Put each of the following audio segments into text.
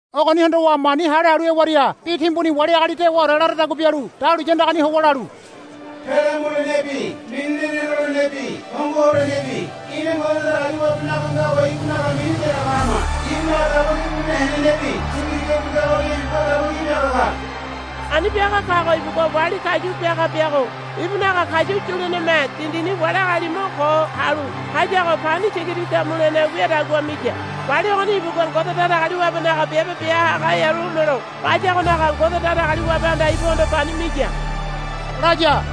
Ogoni hondowa mani hale halu hewaria bi timbuni wali agali dewaore laradagua bialu dahuliya andagani howa lalu, Pele mulenebi mini lene lolenebi hongo holenebi ina Ngode Datagaliwabenaga ngago ibunaga mini yaraga hama. Ibunaga daba ki bulene henenebi tiga tigabi ngagoria ibugua daba ki biaga ka. Ani biaga kago ibugua wali kayu biaga biago ibunaga kayu yuleneme dindini wali agali mo ko halu hayago pani tiga tiga mulene wiadagua miya. Wali ogoni ibugua Ngode Datagaliwabenaga biabe bia haga hearu homelo bayagonaga Ngode Datagaliwabehanda ibuhondo pani miya, laya.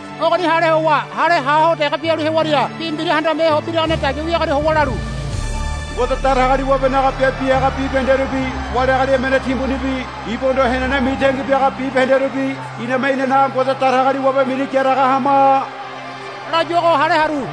Ogoni hale howa hale ha ho dege bialu hewaria bi mbira handame ho biragane dagia wiagoria howa lalu, Ngode Datagaliwabenaga biabe bia haga bibahenderubi wali agali emene timbunibi ibuhondo henene mitangi biaga bibahenderubi iname inanaga Ngode Datagaliwabe mini yaraga hama, layuago hale haru.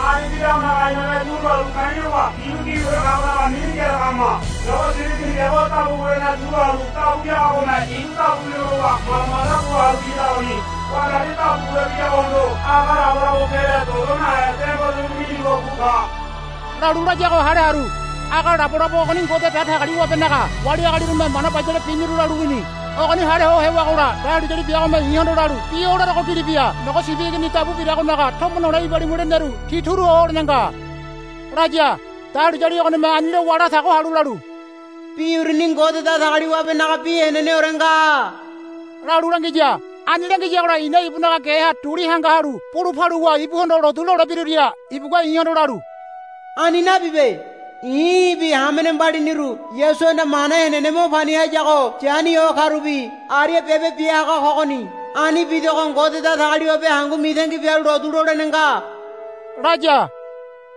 Ani bidagonaga iname turu halu ka̱i̱ lowa ibu gibiore kagonaga mini yaraga hama. Nogo Sibi Igini biago dabu bulene tu halu dabu biagagome ibu dabu bilo lowa manda manda bu halu biyadagoni. Wandari dabu bule biyagohondo aga labolabo pele dodo nahe demborerebi minigo bu ka, lalu layago hale haru. Aga labolabo ogoni Ngode Datagaliwabenaga wali agalirume mana bayale biniru lalu wini. Ogoni hale ho hewagola dahuliyali biagome i̱hondo lalu, Bi o larogo gili bia. Nogo Sibi Igini dabu biragonaga tomo nole ibalimu leneru ti turu ho holene nga, laya. Dahuliyali ogonime ani lowa latago halu lalu, Bi uruni Ngode Datagaliwabenaga bi heneneore nga, lalu langiya. Ani langiyagola i̱na ibunaga geha duli hanga halu bulu paluwa ibuhondo lotu lolebiruria ibugua i̱hondo lalu, Ani nabibe. I̱ í̠bi hamene mbaliniru Yasuhanda mana henene mo pani hayago yani ho karubi aria biabe bia haga kogoni. Ani bidogo Ngode Datagaliwabe hangu mitangi bialu lotu lolene nga, laya.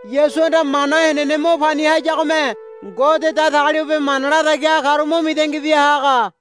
Yasuhanda mana henene mo pani hayagome Ngode Datagaliwabe mana latagi haga karu mo mitangi bia haga.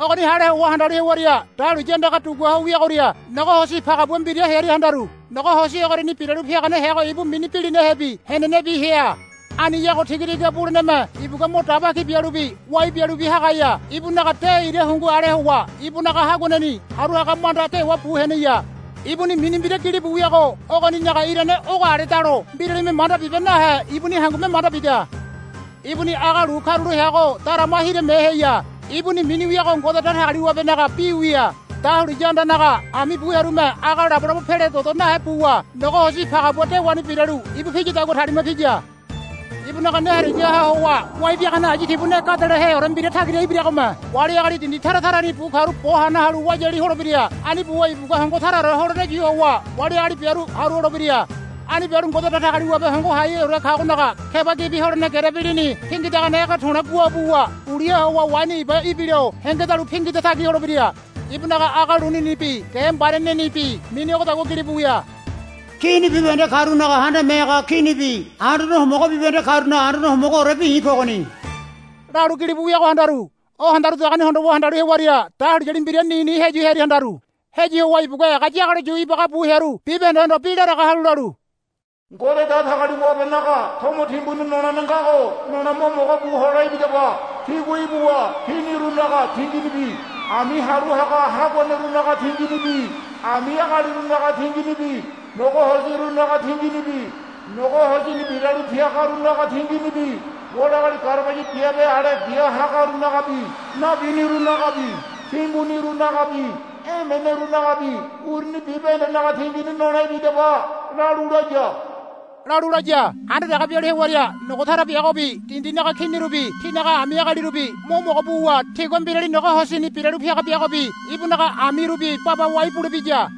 Ogoni hale howa handalu hewaria dahuliya andaga dugua ho wiagoria nogo hosi pagabua mbira hearia handaru. Nogo hosi ogoriani biralu piagane heago ibu mini Bilinahebi Henenebi hea. Aniyago tiga tiga buleneme ibugua mo daba ki bialubi wai bialubi hagaya. Ibunaga de ira hungu ale howa ibunaga haguaneni haru haga manda dewa bu heneya. Ibuni mini mbira gilibu wiago ogoninaga irane ogo aledalo mbiralime manda bibe nahe ibuni hangume manda bida. Ibuni aga lu karulo heago darama hirame heya. Ibuni mini wiago Ngode Datagaliwabenaga Bi wia. Dahuliya andanaga ami bu hearume aga labolabo pele dodo nahe buwa nogo hosi pagabua dewani biralu ibu piyadagua talima piya. Ibunaga ne harigaha howa wai biagane ayu tibu ne gadeleheore mbira tagira ibiragome wali agali dindi tara tarani bu karu bo hana halu wayali holebira. Ani buwa ibugua hongo taraore holene yu howa wali agali biaru haru holebira. Ani bialu Ngode Datagaliwabe Hongo Haiheore kagonaga keba gibi holene gerebi lini pingidagane ege to̱le̱ guabawa uliha howa waini iba ibilo hengedalu pingida tagi holebira. Ibunaga aga luninibi ge mbarianenibi mini ogodagua gilibu wia, Kini bibahende karunaga Handame Haga Kinibi anduane homogo bibahende karunaga Anduane Homogoorebi i̱ kogoni, lalu gilibu wiago handaru. O handarudagoni hondowa handalu hewaria dahuliyali mbira nini heyu hearia handaru. Heyu howa ibugua ega yagalo yu ibaga bu hearu bibahendehondo bi laraga halu lalu, Ngode Datagaliwabenaga tomo timbuni nolene ngago nole mo mogo bu hole ibidaba. Tígua ibuwa kinirunaga tinginibi ami haru haga haguanerunaga tinginibi ami agalirunaga tinginibi nogo hosirunaga tinginibi nogo hosini biralu piagarunaga tinginibi wali agali garabaya biabe ale bia hagarunagabi nabinirunagabi timbunirunagabi emenerunagabi uruni bibahendenaga tingini nole ibidaba, lalu laya. Handa dege bialu hewaria nogo tara biagobi dindinaga kinirubi tinaga ami agalirubi mo mogo buwa tigua mbirali nogo hosini biralu piaga biagobi ibunaga amirubi baba wai bulebiya.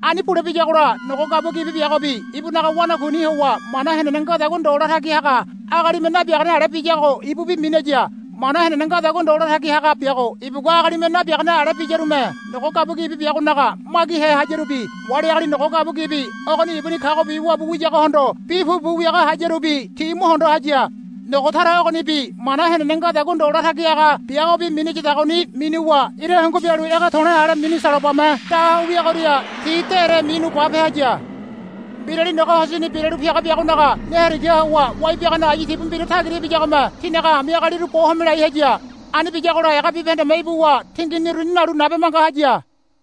Ani bule biyagola nogo gabua gibi biagobi ibunaga wanakuini howa mana henene ngadagua ndo latagi haga agalime nabiagane ale biyago ibubi minaya. Mana henene ngadagua ndo latagi haga biago ibugua agalime nabiagane ale biyarume nogo gabua gibi biagonaga magihe hayarubi wali agali nogo gabua gibi ogoni ibuni kagobi wabu wiyagohondo bi pupu wiaga hayarubi ti mo hondo haya. Nogo tara ogonibi mana henene ngadagua ndo latagi haga biagobi minayadagoni minuwa ira hungu bialu ege to̱le̱ ale mini salobame da ho wiagoria ti dére minu bape haya. Mbirali nogo hosini biralu piaga biagonaga ne harigaha howa wai biagane ayu tibu mbira tagira ibiyagome tinaga ami agaliru bo home lai haya. Ani biyagola ega bibahendeme ibuwa tingini uruni nalu nabe manga haya.